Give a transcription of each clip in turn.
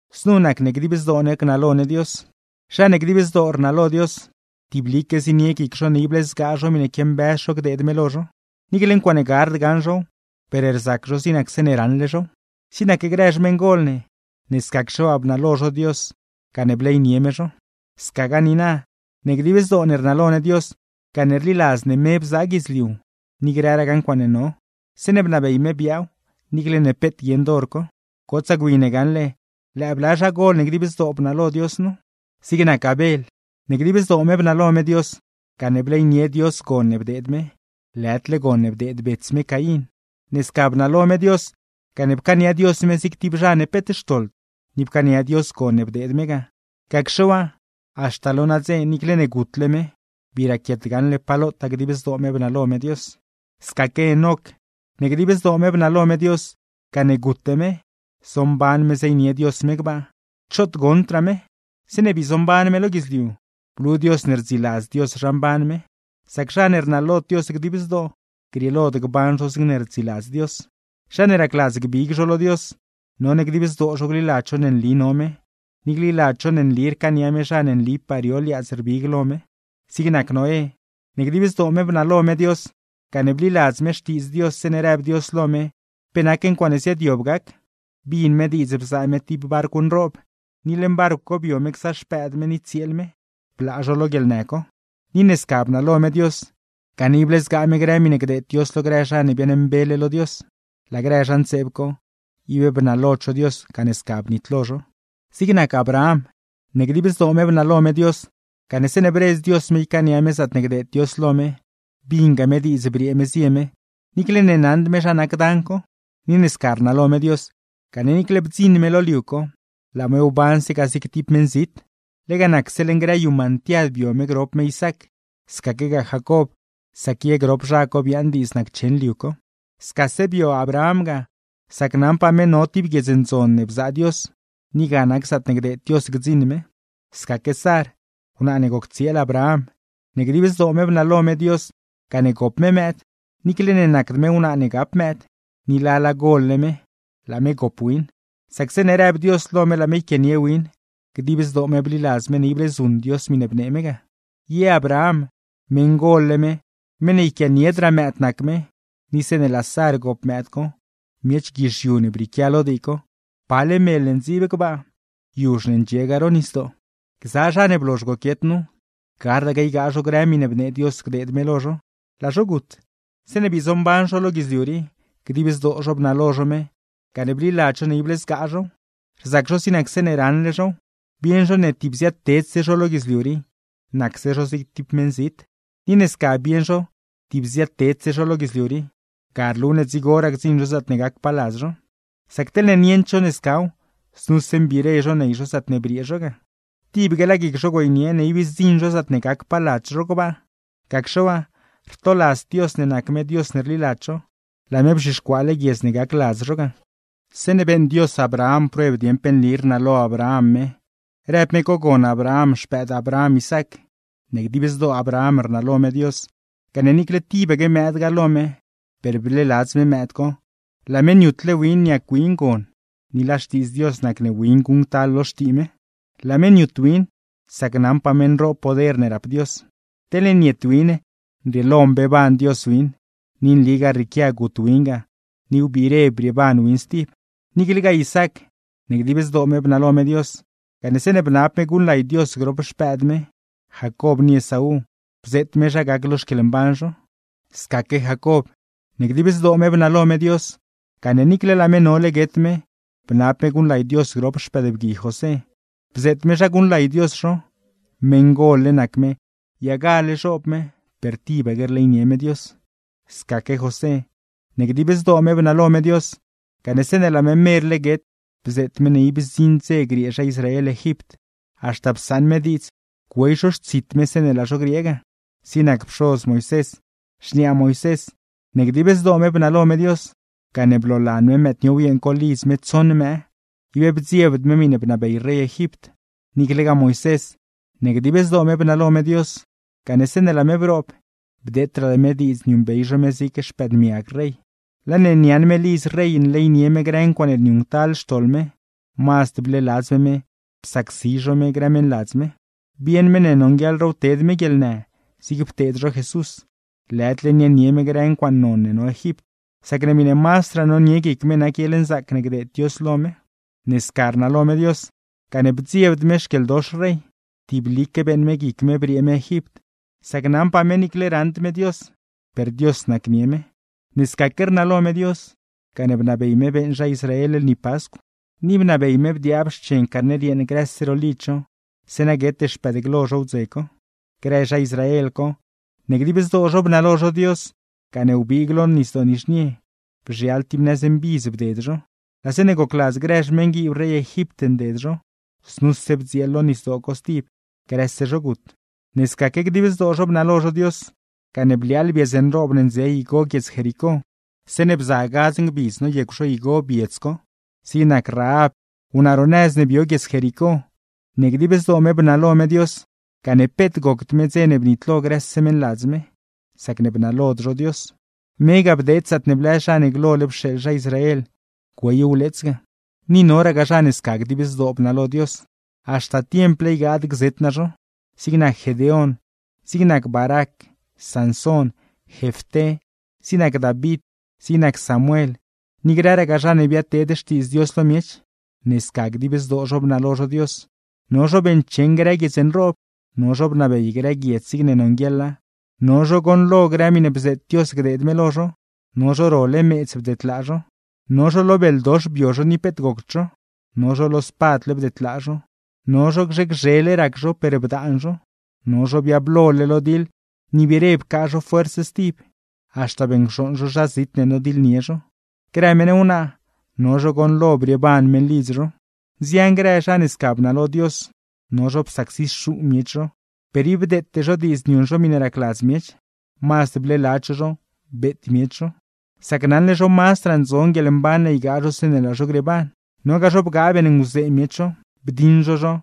Znu nac ne dib zdoo ne gnalo ne Dios. Zha ne dib zdoo rnalo Dios, tiblique zienie guic zho ne ible zgaa zho miṉe quiambëz zho gdeed me lo zho; niicle ncuaaṉe gard gaṉ zhow, per rzac zho zig nac zeeṉe raṉle zhow. Zig nac grë xmeṉgol ne, ne scacxe waa bnalo zho Dios gane bleynie me zho. Scagaa niina, ne dib zdoo ne rnalo ne Dios, gane rliladz ne me bzaa guidzliu ni grëragaa ncuaaṉe no, zeeṉe bnabey me biaaw, niicle ne peet guieṉd hor co. Gotsaa gwi ne gaṉle lëë bla zhagol ne dib zdoo bnalo Dios nu: Zig nac Abel, ne dib zdoo me bnalo me Dios, gane bleynie Dios gon ne bdeed me, lëdle gon ne bdeed bets me Caín. Ne sca bnalo me Dios, gane pcaania Dios me zig tib zha ne peet xtoḻd, ni pcaania Dios gon ne bdeed me ga; gacxe waa, haxta lo nadze, niicle ne gutle me, bii raquiet gaṉle pa lotaa dib zdoo me bnalo me Dios. Scaque Enoc, ne dib zdoo me bnalo me Dios, gane gute me, zomban me zeynie Dios me gbaa, choot goṉdraa me. Zeeṉe bii zomban me lo guidzliu, blu Dios ne rdziladz Dios zha mban me. Sac zha ne rnalod Dios dib zdoo, grieelod gban zho zigne rdziladz Dios. Zha ne racladz gbig zho lo Dios, none dib zdoo zho gliladz zho ne nli no me, ni gliladz zho ne nli rcaania me zha ne nlipaa rio liaadz rbig lo me. Zig nac Noé, ne dib zdoo me bnalo me Dios, gane bliladz me xtiidz Dios zeeṉe rëb Dios lo me pe nac ncuaaṉe ziaadyob gac; bin me diidz bzaa me tib barcw nroob, ni leṉ barcw co bio me gza xpëëd me ni tsieel me, blaa zho lo guieḻnë co. Ni ne sca bnalo me Dios, gane ible zgaa me grë miṉe gdeed Dios lo grë zha ne biaaṉmbele lo Dios; laa grë zha ntseeb co, ib bnalod zho Dios, gane sca bnitlo zho. Zig nac Abraham, ne dib zdoo me bnalo me Dios, gane zeeṉe bredz Dios me ycaania me zaatne gdeed Dios lo me, binga me diidz briee me zie me, niicle ne naṉd me zha nac dan co. Ni ne sca rnalo me Dios, gane niicle bdziṉ me lo liu co, laa me wbanse ga zig tib meṉzit. Lega nacse leṉ grë yu mantiad bio me grop me Isaac, scaquegaa Jacob; sac ye grop zha co biaaṉ diidz naccheṉ liu co. Scase bio Abraham ga, sac naṉpaa me no tib guiedz ndzon ne bzaa Dios, ni ga nac zaatne gdeed Dios gdziṉ me. Scaque Sar, wnaa ne goc tsieel Abraham, ne dib zdoo me bnalo me Dios gane gop me mëëd, niicle ne nacd me wnaa ne gap mëëd, ni lala gol-le me; laa me gop win, sac zeeṉe rëb Dios lo me laa me yquianie win, dib zdoo me bliladz me ible zuṉ Dios miṉe bnee me ga. Ye Abraham, meṉgol-le me, meṉ ne yquianiedraa mëëd nac me, ni zeeṉe laa Sar gop mëëd co, miech guizhiu ne brieequia lo dii co; pale mel ne ndziib gbaa, yuzh ne ndxiegaa ro nisdoo. Gza zha ne blozh goquiet nu, gardaque ygaa zho grë miṉe bnee Dios gdeed me lo zho, laa zho gut; zeeṉe bii zomban zho lo guidzliu rii, dib zdoo zho bnalo zho me gane bliladz zho ne ible zgaa zhow, rzac zho zig nac zeeṉe raṉle zhow. Bieṉ zho ne tib ziaadtedse zho lo guidzliu rii, nacse zho zig tib meṉzit. Ni ne sca bieṉ zho tib ziaadtedse zho lo guidzliu rii, ga rlu ne dzigoraa gdziṉ zho zaatne gacpaa ladz zho. Sac teḻne nieṉd zho ne scaw, znuse mbire zho ney zho zaatne briee zho ga. Tibaque laa guic zho güeynie ne ib zdziṉ zho zaatne gacpaa ladz zho gbaa; gacxe waa, rtoladzd Dios ne nac me Dios ne rliladz zho, laa me bzhixcuaale guiedz ne gac ladz zho ga. Zeeṉe beeṉ Dios Abraham prueb dieṉ pe nli rnalo Abraham me, rëb me cogon Abraham xpëëd Abraham Isaac; ne dib zdoo Abraham rnalo me Dios gane niicle tibaque mëëd ga lo me, per bleeladz me mëëd co, laa me niutle win niac win gon. ¡Ni laa xtiidz Dios nac ne win guṉctal lo xtii me! Laa me niut win, sac naṉpaa ne nroob poder ne rap Dios, teḻne niet win nrieelo mbeeban Dios win; ni nligaa rrieequia gut win ga ni biire brieeban win stib. Niiclegaa Isaac, ne dib zdoo me bnalo me Dios, gane zeeṉe bnab me guṉlay Dios grop xpëëd me, Jacob ni Esaú, bzeet me zha gac lo xquieḻmban zho. Scaque Jacob, ne dib zdoo me bnalo me Dios, gane niicle laa me nole guet me bnab me guṉlay Dios grop xpëëdbgui José, bzeet me zha guṉlay Dios zho; meṉgol-le nac me, yagale zhoob me per tibaque rleynie me Dios. Scaque José, ne dib zdoo me bnalo me Dios, gane zeeṉe laa me merle guet bzeet me ne ib zdziṉ dze griee zha Israel Egipt; haxta psaṉ me diidz güey zho xtsit me zeeṉe laa zho griee ga. Zig nac pxoz Moisés, xniaa Moisés, ne dib zdoo me bnalo me Dios, gane bloolan me mëëd niow yeeṉ co lidz me tsoṉ mëë; ib bdziebd me miṉe bnabey rey Egipt. Niiclegaa Moisés, ne dib zdoo me bnalo me Dios, gane zeeṉe laa me broob bdeetraa me diidz niuṉbey zho me zig xpëëdmiag rey; laa ne niaaṉ me lidz rey nleynie me grë ncuaaṉe niuṉctal xtoḻ me, mazd bleeladz me me psacsi zho me grë meṉladz me. Bieṉ me ne nonguieḻraaw ted me guieḻnë zig pteed zho Jesús, lëdle niaaṉnie me grë ncuaaṉe non ne no Egipt; sacne miṉe mazdraa nonie guic me nac guieḻnzaac ne gdeed Dios lo me. Ne sca rnalo me Dios, gane bdziebd me xquieḻdox rey, tiblique beeṉ me guic me briee me Egipt; sac naṉpaa me niicle raṉd me Dios, per Dios nacnie me. Ne scaque rnalo me Dios, gane bnabey me beeṉ zha Israel lni Pascw, ni bnabey me bdiaab xchen carner yeeṉ grëse ro lidz zho, zeeṉa guete xpëëd glo zho wdze co. Grë zha Israel co, ne dib zdoo zho bnalo zho Dios gane wbiig lo Nisdoo Nizhnie, bzhial tib nëz mbidz bded zho; laa zeeṉe gocladz grë xmeṉguiib rey Egipt nded zho, znuse bdzieel lo nisdoo co stib, grëse zho gut. Ne scaque dib zdoo zho bnalo zho Dios, gane bliaaḻ biedz nroob ne ndze igo guiedz Jericó, zeeṉe bza gadz ngbidz noyecw zho igo biedz co. Zig nac Rahab, wnaa ro nëz ne bio guiedz Jericó, ne dib zdoo me bnalo me Dios, gane peet gocd me dze ne bnitlo grëse meṉladz me, sacne bnalod zho Dios; me ga bdeed zaatne blëz zha ne glole pxeeḻ zha Israel güey wleets ga. Ni noragaa zha ne sca dib zdoo bnalo Dios, haxta tiemple ygaad gzet naa zho. Zig nac Gedeón, zig nac Barac, Sansón, Jefté, zig nac David, zig nac Samuel, ni grëragaa zha ne biadteed xtiidz Dios lo miech. Ne sca dib zdoo zho bnalo zho Dios, no zho beeṉcheṉ grë guiedz nroob, no zho bnabey grë guiedz zigne nonguieḻa, no zho goṉlo grë miṉe bzeet Dios gdeed me lo zho, no zho role meedz bdedlaa zho; no zho lo beldox bio zho ni peet gocd zho, no zho lo spadle bdedlaa zho, no zho gzhe gzhele rac zho per bdaan zho; no zho biablole lo diḻ ni biire pcaa zho fuerz stib, haxta beṉcxooṉ zho zha zit ne nodiḻnie zho. Grë meṉ wnaa, no zho goṉlo brieeban meṉlidz zho. Nzian grë zha ne sca bnalo Dios, no zho psacsixuu miech zho, per ib bdeete zho diidz niuṉ zho miṉe racladz miech, mazd bleeladz zho zho beet miech zho; sac naṉle zho mazdraa ndzon guieḻmban ne ygaa zho zeeṉe laa zho grieeban. Nogaa zho bgaa beeṉnguzee miech zho, bdiṉ zho zho,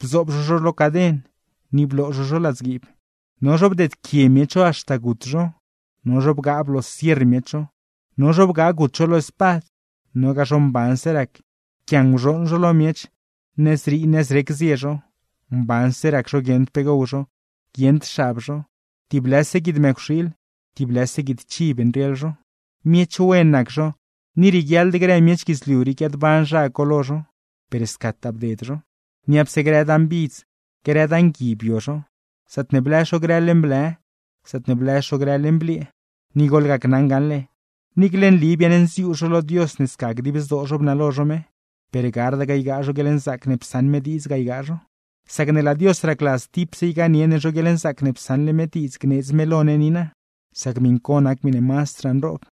bzoob zho zho lo caden, ni bloo zho zho ladzguiib; no zho bdeedquie miech zho haxta gut zho, no zho bgaa bloosierr miech zho, no zho bgaa gut zho lo spad. Nogaa zho mbanse rac, pquianguzhooṉ zho lo miech, nëzrii nëzrec zie zho, mbanse rac zho guieṉd pe gow zho, guieṉd xab zho, tib lëse guid mëcwxiil, tib lëse guid chiv nrieḻ zho. Miech wen nac zho, ni rieguiaḻd grë miech guidzliu rii guiaadban zha co lo zho, per scataa bded zho. Niapse grë dan bidz, grë dan gui, bio zho; zaatne blëz zho grë leṉ blë, zaatne blëz zho grë leṉ bliee. Ni goḻgacnaṉ gaṉle, niicle nli biaṉnziuu zho lo Dios ne sca dib zdoo zho bnalo zho me, per gardaque ygaa zho guieḻnzaac ne psaṉ me diidz ga ygaa zho; sacne laa Dios racladz tipse ygaanie ne zho guieḻnzaac ne psaṉle me diidz gneedz me lo ne niina, sac miṉ co nac miṉe mazdraa nroob.